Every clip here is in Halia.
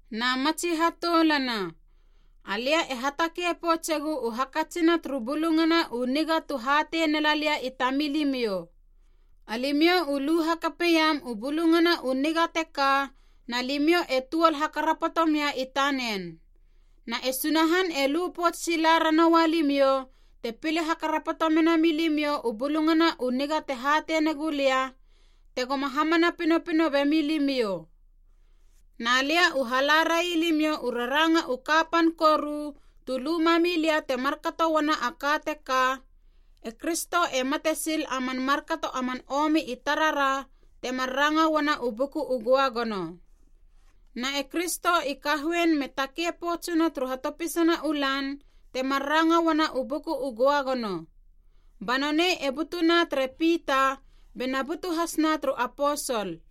Na matsi hatoulana, alia e hatakei poutsegu u hakatsina turu Bulungana u Niga tu hatei nela lia i tamilimiou. Alimiou u lu hakapeiam u Bulungana u Niga teka na limiou e tuol hakarapoto mia i tanen. Na e Sunahan e lu pouts sila ranoua limiou, te pile hakarapoto menami limiou u Bulungana u Niga te hatei negulia, tegoma hamana pinopino bemi limiou. Na lia u hala rai limiou u raranga u kapan koru tu lu mami lia te markato uana a ka teka, e Kristo e mate sil a man markato a man omi i tarara, temar ranga uana u Buku u Göagono. Na e Kristo i kahoein me takei poutsuna turu hatopisana u lan, temar ranga uana u Buku u Göagono. Ba nonei e butuna tere Pita, bena butu hasna turu aposol.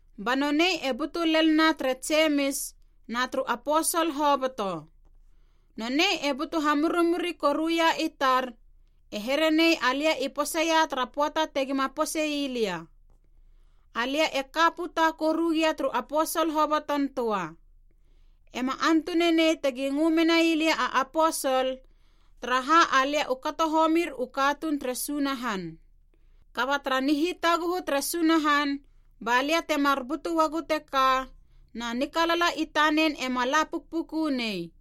Ba nonei e butu lel na tere Jemis, na turu aposol hoboto. Nonei e butu hamurimuri koruia i tar, e herenei alia i poseia tara pöata tegima posei lia. Alia e ka puta koru gia turu aposol hoboton töa. Ema antunanei tegi ngö menai lia a aposol, taraha alia u kato homir u katuun tere Sunahan. Kaba tara nihitaguhu tere Sunahan ba lia temar butu uagu teka, na nikalala i tanen ema la pukpuku nei.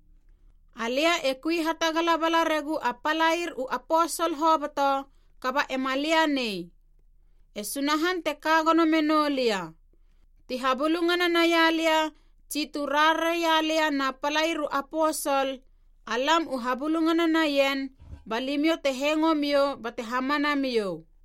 Alia e kui hatagala bala regu a palair u aposol hoboto, kaba ema lia nei. E Sunahan te ka gono menou lia. Ti habulungana naia lia tsi tu rarare ia lia na palair u aposol, alam u habulungana naien ba limiou te hengo miou bate hamana miou.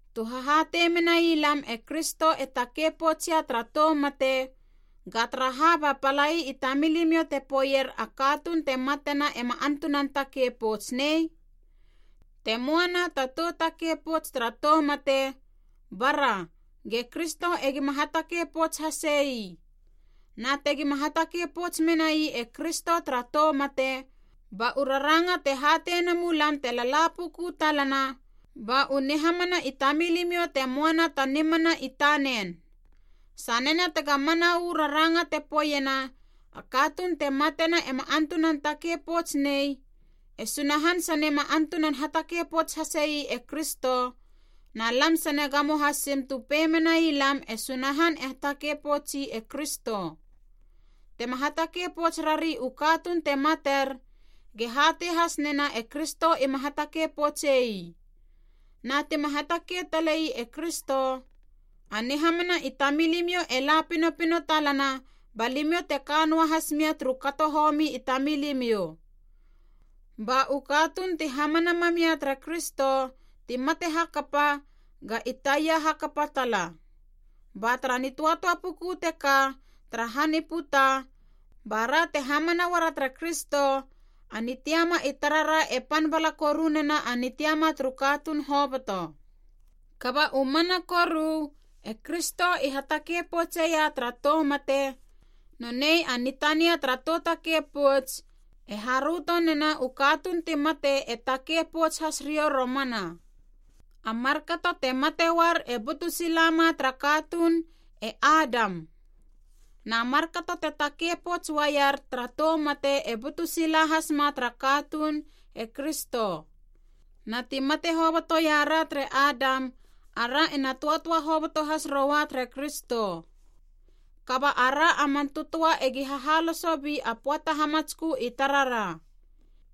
Tu hahatei menai lam e Kristo e takei poutsia tara tou mate, ga taraha ba palai i tamilimiou te poeier a katuun te matena ema antunan takei pouts nei? Te möa na ta tou takei pouts tara tou mate, bara, ge Kristo egima hatakei pouts hase ii. Na tegima hatakei pouts menai e Kristo tara tou mate, ba u raranga te hatei nemu lam te lala puku talana ba u nihamana i tamilimiou te moana ta nimana i tanen. Sanena tega mana uu raranga te poeiena a katuun te matena ema antunan takei pouts nei, e Sunahan sane ma antunan hatakei pouts hase ii e Kristo, na lam sane gamo hasim tu pei menai lam e Sunahan e hatakei poutsi e Kristo. Tema hatakei pouts rari u katuun te mater, ge hatei has nena e Kristo ima hatakei poutse ii. Na tima hatakei tale ii e Kristo, a nihamana i tamilimiou e la pinopino talana ba limiou te ka noa has mia turu kato homi i tamilimiou. Ba u katuun ti hamana mam ia tere Kristo, ti mate hakapa, ga i taia hakapa tala. Ba tara nitöatöa puku teka tara han i puta bara te hamana uara tere Kristo, a nitiama i tarara e pan bala koru nena a nitiama turu katuun hoboto. Kaba u mana koru, e Kristo i hatakei poutseia tara tou mate, nonei a nitania tara tou takei pouts, e haröto nena u katuun ti mate e takei pouts has riou romana. A markato te mate uar e butu silama tara katuun, e Adam. Na markato te takei pouts uaier tara tou mate e butu sila hasma tara katuun, e Kristo. Na ti mate hoboto ia ra tere Adam ara ena töatöa hoboto has roua tere Kristo. Kaba ara a man tötöa egi hahaloso bi a pöata hamatskö i tarara.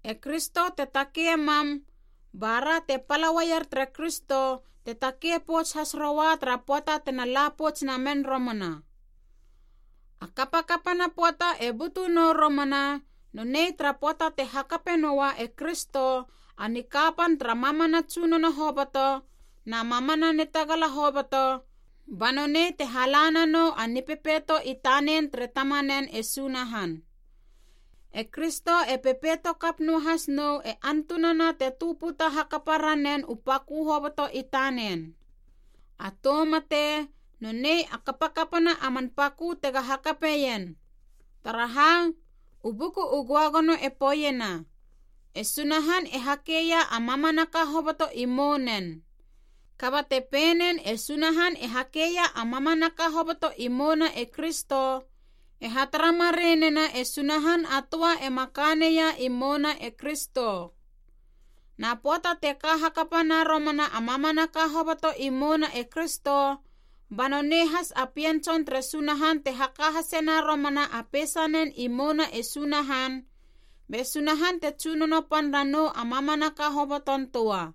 E Kristo te takei mam, ba ra te pala uaier tere Kristo te takei pouts has roua tara pöata tena la pouts namen romana. A kapakapana pöata e butu nou romana nonei tara pöata te hakape noa e Kristo a nikapan tara mamana tsunono hoboto na mamana nitagala hoboto, ba nonei te hala nanou a Nipepeito i tanen tere Tamanen e Sunahan. E Kristo e pepeitokap noahas nou e antunana te tö puta hakapa ranen u pakö hoboto i tanen. A tou mate, nonei a kapakapana a man pakö tega hakapeien. Taraha, u Buku u Göagono e poeiena, “E Sunahan e hakeia a mamanaka hoboto i mounen.” Kaba te pei nen e Sunahan e hakeia a mamanaka hoboto i mouna e Kristo, e hatara mareinena e Sunahan a töa ema ka neia i mouna e Kristo. Na pöata te ka hakapana romana a mamanaka hoboto i mouna e Kristo, ba nonei has a Pien Tson tere Sunahan te haka hasena romana a peisanen i mouna e Sunahan, be Sunahan te tsunono pan nanou a mamanaka hoboton töa.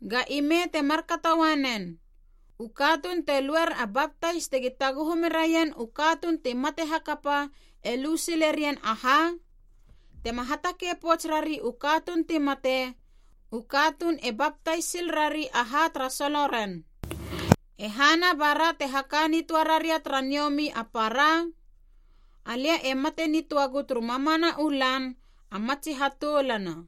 Ga ime te markato ua nen. U katuun te luer a baptais tegi taguhu meraien u katuun ti mate hakapa e lu silerien aha? Tema hatakei pouts rari u katuun ti mate, u katuun e baptais sil rari aha tara solo ren. E hana bara te haka nitöa raria tara niomi a para? Alia e mate nitöagu turu mamana u lan a matsi hatoulana.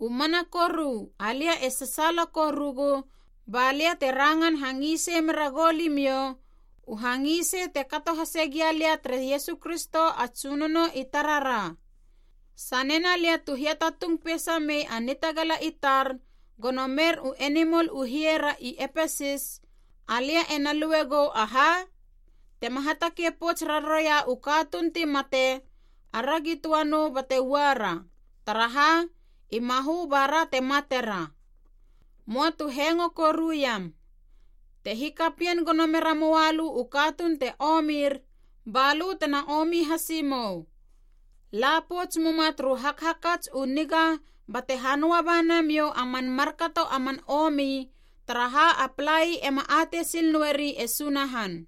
U mana koru alia e sasaala korugu ba lia te rangan hangisei mera gou limiou, u hangisei te kato hasegia lia tere Iesu Kristo a Tsunono i tarara. Sanena lia tu hiatatung peisa mei a nitagala i tar, gono mer u enimol u hie ra i Epesis, alia ena lui gou aha? Tema hatakei pouts raroia u katuun ti mate, “Aragi töa nou bate uara, taraha i mahö bara te matera.” Möa tu hengo koruiam. “Te hikapien gono mera moa lö u katuun te omir, ba lö tena omi hasi mou.” La pouts muma turu hakhakats u haniga bate hanöa ba namiou a man markato a man omi taraha a palai ema atei sil noeri e Sunahan.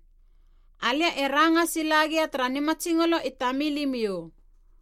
Alia e ranga sila gia tara nimatsingolo i tamilimiou.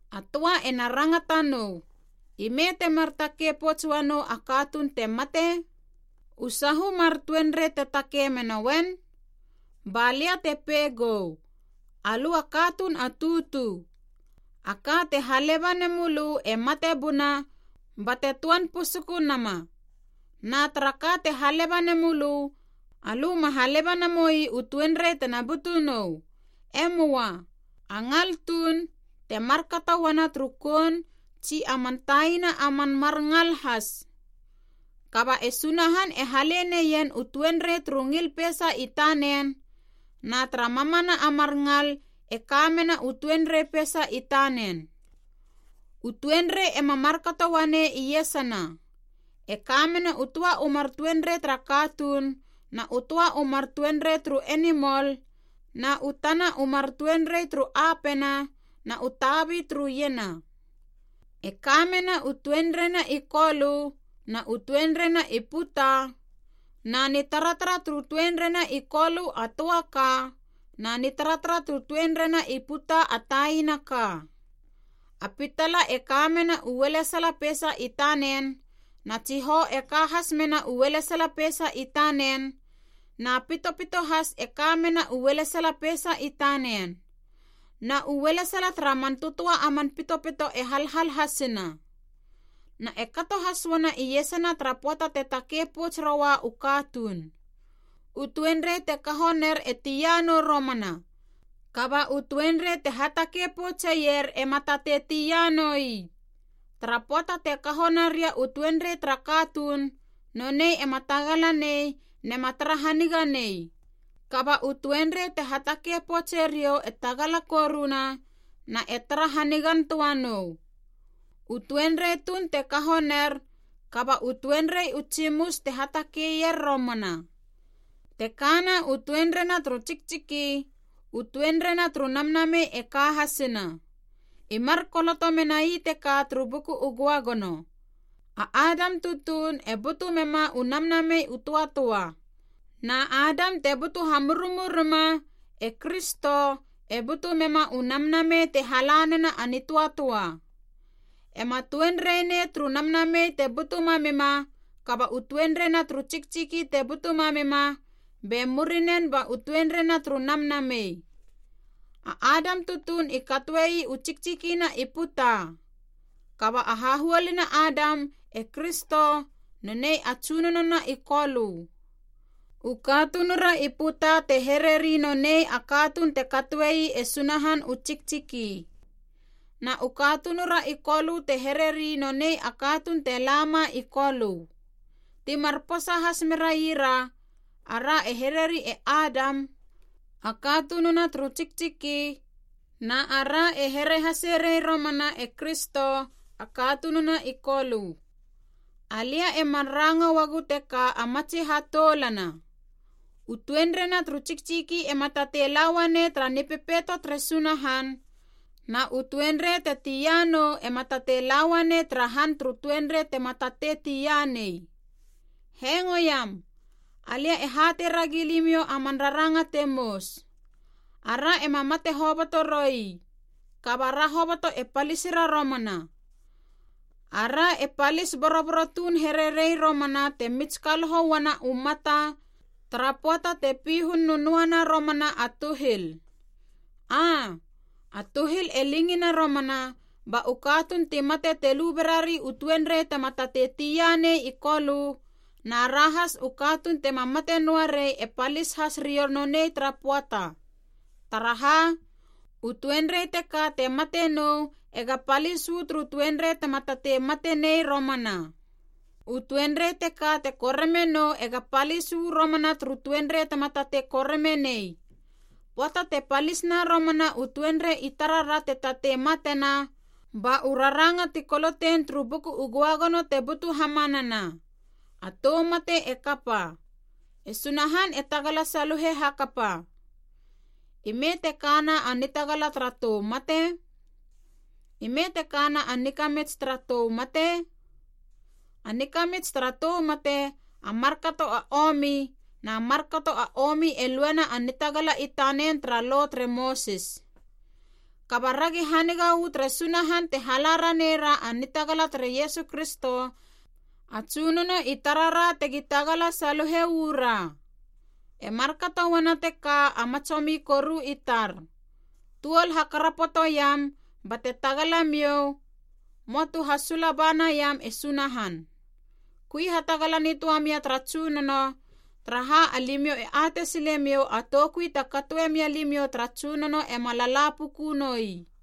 A töa ena rangata nou, “Ime temar takei pouts uanou a katuun te mate? U sahu mar tuenrei te takei menoen?” Ba lia te pei gou, alö a katuun a tutu. A ka te haleba nemölö e mate buna bate töan pusuku nama. Na tara ka te haleba nemölö, alö ma haleba namoi u tuenrei tena butu nou, e möa, a ngal tuun, te markato uana turu koun tsi a man taina a man mar ngal has. Kaba e Sunahan e hale neien u tuenrei turu ngil peisa i tanen, na tara mamana a mar ngal e ka mena u tuenrei peisa i tanen. U tuenrei ema markato uanei iesana, e kamena u töa u mar tuenrei tara katuun na u töa u mar tuenrei turu enimol na u tana u mar tuenrei turu apena na u tabi turu iena. E kamena u tuenreina i kolö na u tuenreina i puta, na nitaratara turu tuenreina i kolö a töa ka, na nitaratara turu tuenreina i puta a taina ka. A pitala e ka mena u ualesala peisa i tanen, na tsihou e ka has mena u ualesala peisa i tanen, na pitopito has e ka mena u ualesala peisa i tanen. Na u ualesala tara man tötöa a man pitopito e halhal hasina. Na e kato has uana iesana tara pöata te takei pouts roua u katuun. U tuenrei te kaho ner e tia nou romana. Kaba u tuenrei te hatakei poutseier ema tatei tia noi. Tara pöata te kaho naria u tuenrei tara katuun, nonei ema tagala nei nema tara haniga nei. Kaba u tuenrei te hatakei poutse riou e tagala koruna na e tara hanigan töa nou. U tuenrei tuun te kaho ner, kaba u tuenrei u tsimus te hatakeier romana. Te kana u tuenreina turu tsiktsiki, u tuenrei na turu namnamei e ka hasina. I mar koloto menai teka turu Buku u Göagono, “A Adam tutuun, e butu mema u namnamei u töatöa.” Na Adam te butu hamururima, e Kristo, e butu mema u namnamei te hala nena a nitöatöa. Ema tuenrei nei turu namnamei te butu mamima, kaba u tuenreina turu tsiktsiki te butu mamima, be murinen ba u tuenreina turu namnamei. A Adam tutuun i katoe ii u tsiktsikina i puta. Kaba a hahuoluna Adam, e Kristo, nonei a Tsunonona i Kolö. U katunura i puta te hereri nonei a katuun te katoe ii e Sunahan u tsiktsiki. Na u katunura i Kolö te hereri nonei a katuun te lama i Kolö. Ti mar posa has meraira, ara e herei e Adam, a katununa turu tsiktsiki, na ara e here haserei romana e Kristo, a katununa i Kolö. Alia emar ranga uagu teka a matsi hatoulana: u tuenreina turu tsiktsiki ema tatei la uanei tara Nipepeito tere Sunahan na u tuenrei te tia nou ema tatei la uanei tara han turu tuenrei te ma tatei tia nei. Hengoiam! Alia e hatei ragi limiou aman raranga te mous: ara ema mate hoboto roi, kaba ra hoboto e palisira romana. Ara e palis boroboro tuun here rei romana te mitskaloho uana u mata, tara pöata te pihun nönöana romana a tuhil. Aa, a tuhil e lingina romana, ba u katuun ti mate te lu berari u tuenrei tema tatei tia nei i kolö na ra has u katuun tema mate noa rei e palis has riou nonei tara pöata. Taraha, u tuenrei teka te mate nou ega palis uu turu tuenrei tema tatei mate nei romana. U tuenrei teka te koreme nou ega palis uu romana turu tuenrei tema tatei koreme nei. Pöata te palisna romana u tuenrei i tarara te tatei matena, ba u raranga ti kolotein turu Buku u Göagono te butu hamanana: “A tou mate e kapa. E Sunahan e tagala saluhe hakapa.” “Ime te kana a nitagala tara tou mate? Ime te kana a nikamits tara tou mate?” A nikamits tara tou mate, a markato a omi, na markato a omi e luena a nitagala i tanen tara Lo tere Mosis. Kaba ragi haniga uu tere Sunahan te hala ranei ra a nitagala tere Iesu Kristo a Tsunono i tarara tegi tagala saluhe uu ra. E markato uana teka a matsomi koru i tar, tuol hakarapotoiam, bate tagala miou, möa tu hasula ba naiam e Sunahan. Kui hatagala nitöa mia tara Tsunono, taraha alimiou e atei silemiou a toukui te katoe mia limiou tara Tsunono ema lala puku noi.